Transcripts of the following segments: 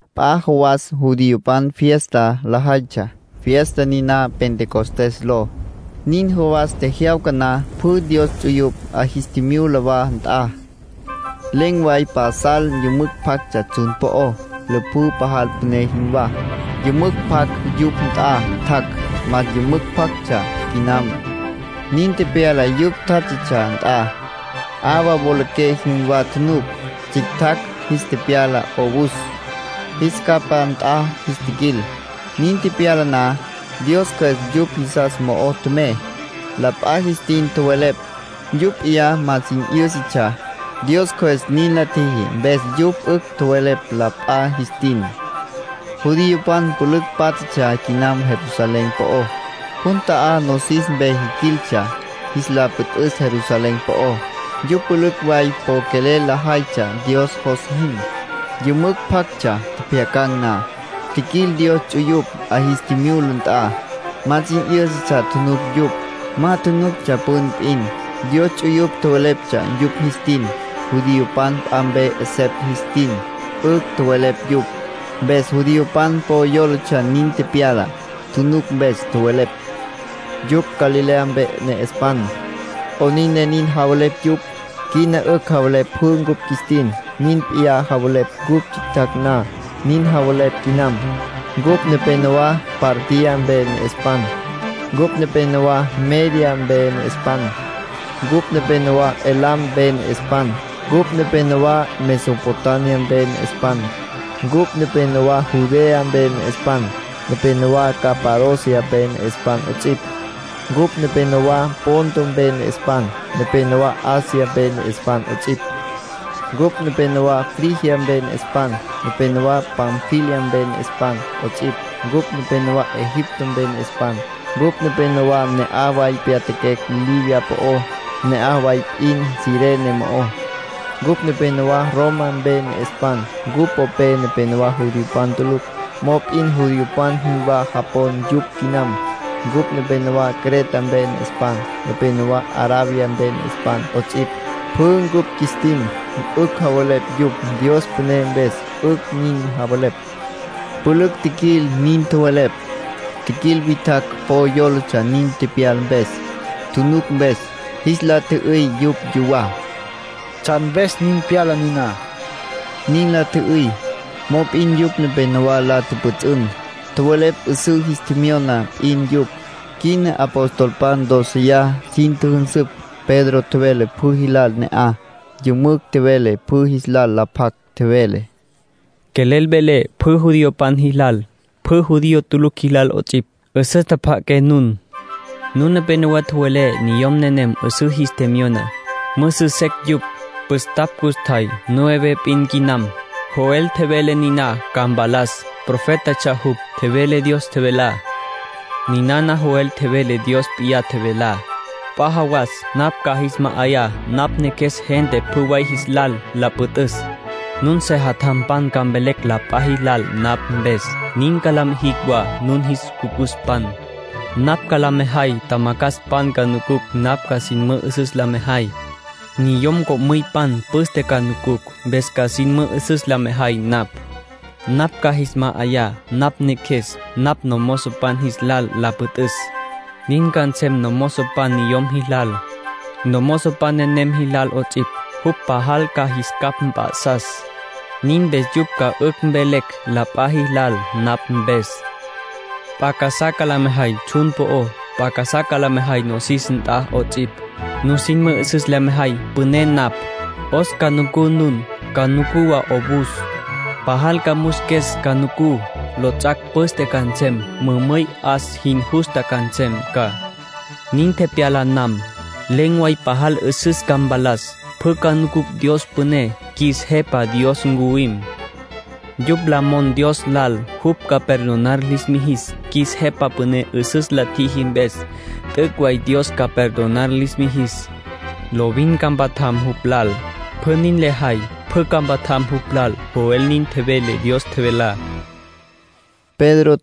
P'a jawas judiopan fiesta lajaytsja, fiesta niná Pentecostés ló. Nin jawas tjejyawca na, pjü Dios ts'uyupj 'a jis tjimyula wa nt'a. Len̈ way pasal yümücj pjactsja tsjun po'ó, lüpjǘ pajal püné jinwá. Yümücj pjac yupj nt'a tjac'. Más yümücj pjactsja quinam, nin tepyala yupj tjátjatsja nt'a. 'Awa wolaqué jinwá tjunuc. Tsjictjacj jis tepyala 'owus, jis capá nt'a jis tjiquil. Nin tepyala na, Dios Cjües yupj jisas mo'o tjemey. La p'a jis tin tjowelepj, yupj p'iyá ma sin 'yǘsatsja. Dios Cjües nin la tjiji mpes yupj 'ücj tjowelepj la p'a jis tin. Judiopan pülücj pátjatsja quinam Jerusalén po'ó. Jun ta'á nosis mpe jiquiltsja jis la püt'üs Jerusalén po'ó. Yupj pülücj way po quelel lajaytsja Dios jos jin. Yümücj pjactsja tjepjyacan̈ na, tjiquil Dios ts'uyupj 'a jis tjimyula nt'a. Ma sin 'yǘsatsja tjunuc yupj. Ma tjunuctsja püna p'in. Dios ts'uyupj tjoweleptsja yupj jis tin. Judiopan p'a mpe 'esepj jis tin 'ücj tjowelepj yupj. Mpes judiopan po yólatsja nin tepyala, tjunuc mpes. Tjowelepj: —Yupj Galilea mpe ne'espan. ¿'Onin ne nin javelepj yupj? Quina 'ücj javelepj pjü cupj qjuis tin. Nin p'iyá tjevelecj cupj tsjictsja na, nin javelepj quinam. Cupj nepenowá Partia mpe ne'espan. Cupj nepenowá Media mpe ne'espan. Cupj nepenowá Elam mpe ne'espan. Cupj nepenowá Mesopotamia mpe ne'espan. Cupj nepenowá Judea mpe ne'espan, nepenowá Capadocia mpe ne'espan 'ots'ipj. Cupj nepenowá Ponto mpe ne'espan, nepenowá Asia mpe ne'espan 'ots'ipj. Cupj nepenowá Frigia mpe ne'espan, nepenowá Panfilia mpe ne'espan 'ots'ipj. Cupj nepenowá Egipto mpe ne'espan. Cupj nepenowá ne'aj way tepyatjaquecj Libia po'ó, ne'aj way p'in Cirene mo'ó. Cupj nepenowá Roma mpe ne'espan. Cupj popé nepenowá judiopan tulucj, mop'in judiopan jinwá japon yupj quinam. Cupj nepenowá Creta mpe ne'espan, nepenowá Arabia mpe ne'espan 'ots'ipj. Pjü cupj qjuis tin, 'ücj javelepj yupj. Dios püné mpes 'ücj nin javelepj —pülücj tjiquil nin tjowelepj. Tjiquil witjacj po yólatsja nin tepyala mpes, tjunuc mpes. Jis la tjü'üy yupj yuwá: “¿Tsjan mpes nin pyala niná?” nin la tjü'üy. Mop'in yupj nepenowá la tjüpjüts'ün. Tjowelepj 'üsǘ jis tjemyona p'in yupj. Quina apostolpan dóceya sin tjüjünsüpj. Pedro tjevele pjü jilal ne'aj. Yümücj tjevele pjü jis la pjac. Tjevele: “Quelel velé pjü judiopan jilal, pjü judío tulucj jilal 'ots'ipj. 'Üsüs tjapja'aqué nun. Nun nepenowá tjowelé niyom nenem 'üsǘ jis tjemyona. Müsü secj yupj. Püstapj custjay. Nueve p'in quinam. Joel tjevele niná ca mpalas. Profétatsja jupj; tjevele Dios tjevelá. Ninana Joel tjevele Dios p'iyá tjevelá: ‘P'a jawas napj ca jis ma'ayá napj Neqjues gente pjü way jis lal la püt'üs. Nun sejatjampan ca mvelecj la p'a jilal napj mpes. Nin ca la mijicj wa nun jis cucuspan. Napj ca la mejay tjamacjaspan ca nucucj napj ca sin mü'üsüs la mejay. Niyom co'müypan püste ca nucucj, mpes ca sin mü'üsüs la mejay napj. Napj ca jis ma'ayá napj Neqjues napj nomozopan jis lal la püt'üs. Nin ca nsem nomozopan niyom jilal, nomozopan nequem jilal 'ots'ipj. Jupj pajal ca jis capj mp'a'sas. Nin mpes yupj ca 'ücj mvelecj la p'a jilal napj mpes. P'a casá la mejay tsjun po'ó. P'a casá la mejay nosis nt'a 'ots'ipj. Nusin mü'üsüs la mejay püné napj. 'Os ca nucú nun. Ca nucú wa 'owus. Pajal ca musques ca nucú. Lots'ac' püste ca nsem. Mümüy 'as jin justa nsem ca. Nin tepyala nam, len̈ way pajal 'üsüs ca mpalas. Pjü ca nucucj Dios püné. Qjuis Jepa Dios ncuwim. Yupj la mon Dios lal jupj ca perdonar lis mijis qjuis Jepa Püné 'üsüs la tjiji mpes, t'üc' way Dios ca perdonar lis mijis. Lovin ca mpatjam jupj lal. Pjü nin lajay, pjü ca mpatjam jupj lal’. Joel nin tjevele Dios tjevelá”, tjevele Pedro.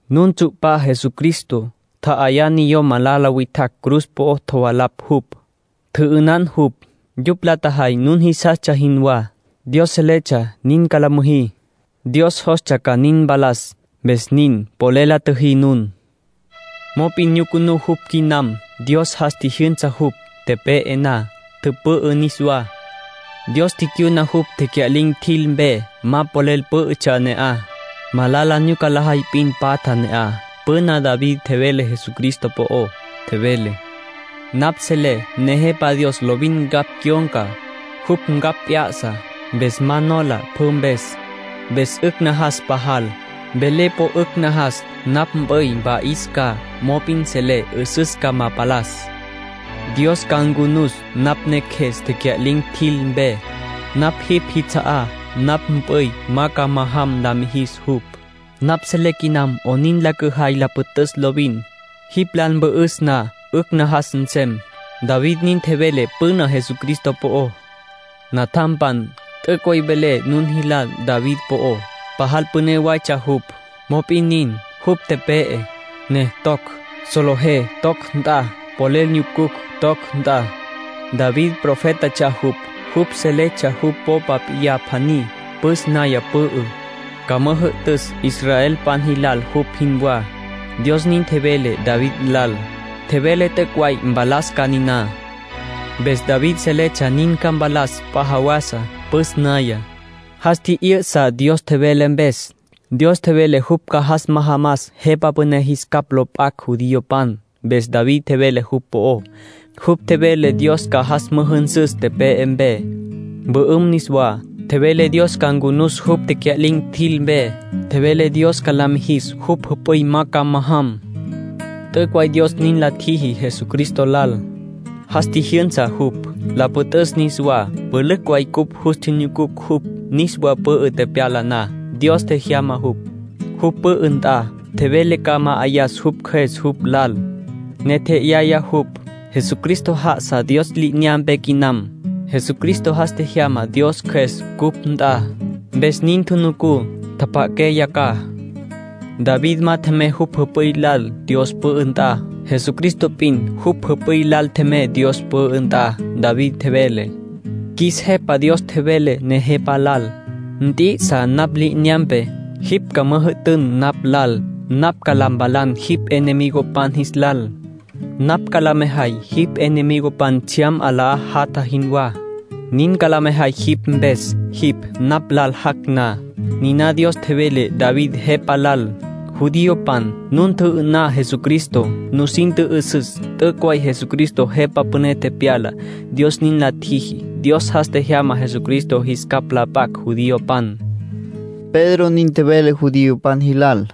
Nun tsu'pá Jesucristo. Tja'ayá niyom malala witjacj cruz po'o tjovalapj jupj. Tjü'ünan jupj. Yupj la tjajay nun jisastsja jinwá. Dios seletsja nin ca la müjí. Dios jostsja ca nin mpalas, mpes nin polel la tjüjí nun. Mop'in nyucunú jupj quinam. Dios jas tjijyünsa jupj, tepe'e na. Tüpü'ü niswá. Dios ticyuna jupj tecya'lin̈ tjil mpe. Ma polel pǘ'ütsja ne'aj. Malala nyuca lajay p'in patja ne'aj. Püna David tjevele Jesucristo po'ó. Tjevele: ‘Napj selé Nejepa Dios lovin ncapj cyon̈ca. Jupj ncapj p'ya'sa. Mpes ma nola pjü mpes. Mpes 'ücj najas pajal. Velé po 'ücj najas. Napj mp'üy mpa'is ca, mop'in selé 'üsüs ca ma palas. Dios ca ncunus napj neqjues tecya'lin̈ tjil mpe. Napj jipj jits'a'á. Napj mp'üy ma ca majam la mijis jupj. Napj selé quinam 'onin la cüjay la püt'üs lovin. Jipj lal mpü'üs na, 'ücj najas nsem.’ David nin tjevele püná Jesucristo po'ó. ”Natjampan, t'üc' way velé nun jilal David po'ó, pajal püné waytsja jupj. Mop'in nin, jupj tepe'e, ne toc. Solejé toc nt'a. Polel nyucucj toc nt'a. David profétatsja jupj. Jupj seletsja jupj popa p'iyá pjaní, püs naya pü'ü, ca müjü'tüs israelpan jilal jupj jinwá. Dios nin tjevele David lal. Tjevele t'üc' way mpalas ca niná. Mpes David seletsja nin ca mpalas p'a jawasa, püs naya. Jas tji'yüsa Dios tjevele mpes, Dios tjevele jupj ca jas majamas Jepa Püné jis capj lo p'acj judiopan. Mpes David tjevele jupj po'ó. Jupj tjevele Dios ca jas müjünsüs tepe'e mpe, mpü'üm niswá. Tjevele Dios ca ncunus jupj tecya'lin̈ tjil mpe. Tjevele Dios ca la mijis jupj jüp'üy ma ca majam. T'üc' way Dios nin la tjiji Jesucristo lal. Jas tjijyünsa jupj, la püt'üs niswá. Pülücj way cupj jus tjinyucucj jupj, niswa pü'ü tepyala na. Dios tjemyana jupj, jupj pü'ü nt'a. Tjevele ca ma'ayas jupj Cjües jupj lal, ne tje'yaya jupj. Jesucristo já'asa Dios li'inyampe quinam. Jesucristo jas tjejyama Dios Cjües cupj nt'a, mpes nin tjunucú, tjapja'aqué yacjaj. David ma tjemey jupj jüp'üy lal Dios pü'ü nt'a. Jesucristo p'in jupj jüp'üy lal tjemey Dios pü'ü nt'a. David tjevele: ‘Qjuis Jepa Dios tjevele Nejepa lal: “Nt'i'isa napj li'inyampe. Jipj ca müjü'tün napj lal. Napj ca la mpalan jipj enemigopan jis lal. Napj ca la mejay jipj enemigopan tsjyam 'alá jatja jinwá. Nin ca la mejay jipj mpes, jipj napj lal jac' na.” ’ Niná Dios tjevele David Jepa lal. ”Judiopan, nun tjü'ü'ná Jesucristo. Nusin tjü'üsüs t'üc' way Jesucristo Jepa Püné tepyala, Dios nin la tjiji. Dios jas tjejyama Jesucristo jis capj la p'acj judiopan”, Pedro nin tjevele judiopan jilal.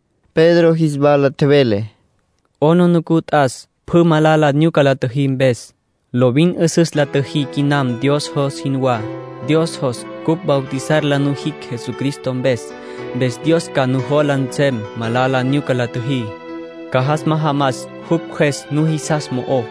Pedro jis wala tjevele: —'Aplijila t'as pjü malala nyuca la tjüjí mpes. Lovin 'üsüs la tjüjí quinam Dios jos jinwá. Dios jos cupj bautizar la nujicj Jesucristo mpes. Mpes Dios ma ca jola nsem malala nyuca la tjüjí. Ca jas majamas jupj Cjües nujisas mo'ó.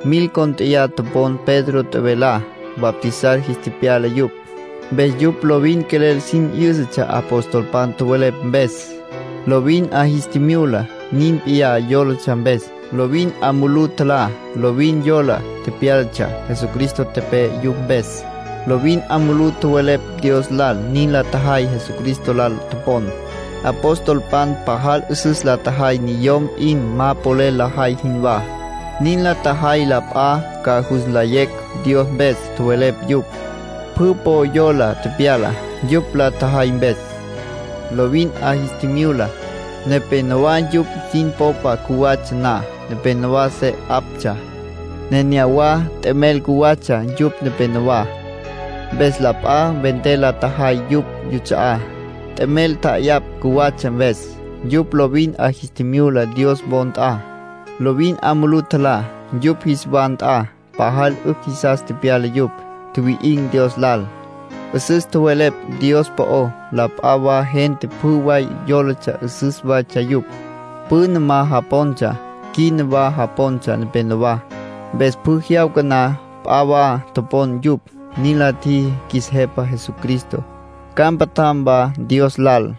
Mil cónt'eya topon Pedro tjevelá. Bautizar jis tepyala yupj. Mpes yupj lovin quelel sin 'yǘsatsja apostolpan tjowelepj mpes. Lovin 'a jis tjimyula, nin p'iyá yólatsja mpes. Lovin 'a mulú tjalá, lovin yola tepyálatsja Jesucristo tepe'e yupj mpes. Lovin 'a mulú tjowelepj Dios lal. Nin la tjajay Jesucristo lal topon. Apostolpan pajal 'üsüs la tjajay niyom p'in ma polel lajay jinwá. Nin la tjajay la p'a ca jus nlayecj Dios mpes tjowelepj yupj. Pjü po yola tepyala, yupj la tjajay mpes. Lovin 'a jis tjimyula. Nepénowa yupj sin popa cjuwatsja na, nepénowa se 'aptsja. Nenéyawa t'emel cjuwatsja yupj nepenowá. Mpes la p'a vender la tjajay yupj yuts'a'á, t'emel tja'ayapj cjuwatsja mpes. Yupj lovin 'a jis tjimyula Dios wo nt'a. Lovin 'a mulú tjalá yupj jis wa nt'a. Pajal 'ücj jisas tepyala yupj. Tjuwi'in̈ Dios lal. 'Üsüs tjowelepj Dios po'ó. La p'a wa gente pjü way yólatsja 'üsüs waytsja yupj. Püna ma japontsja, quina wa japontsja nepenowá, mpes pjü jyawca na p'a wa topon yupj, nin la tjiji qjuis Jepa Jesucristo. Ca mpatjam wa Dios lal.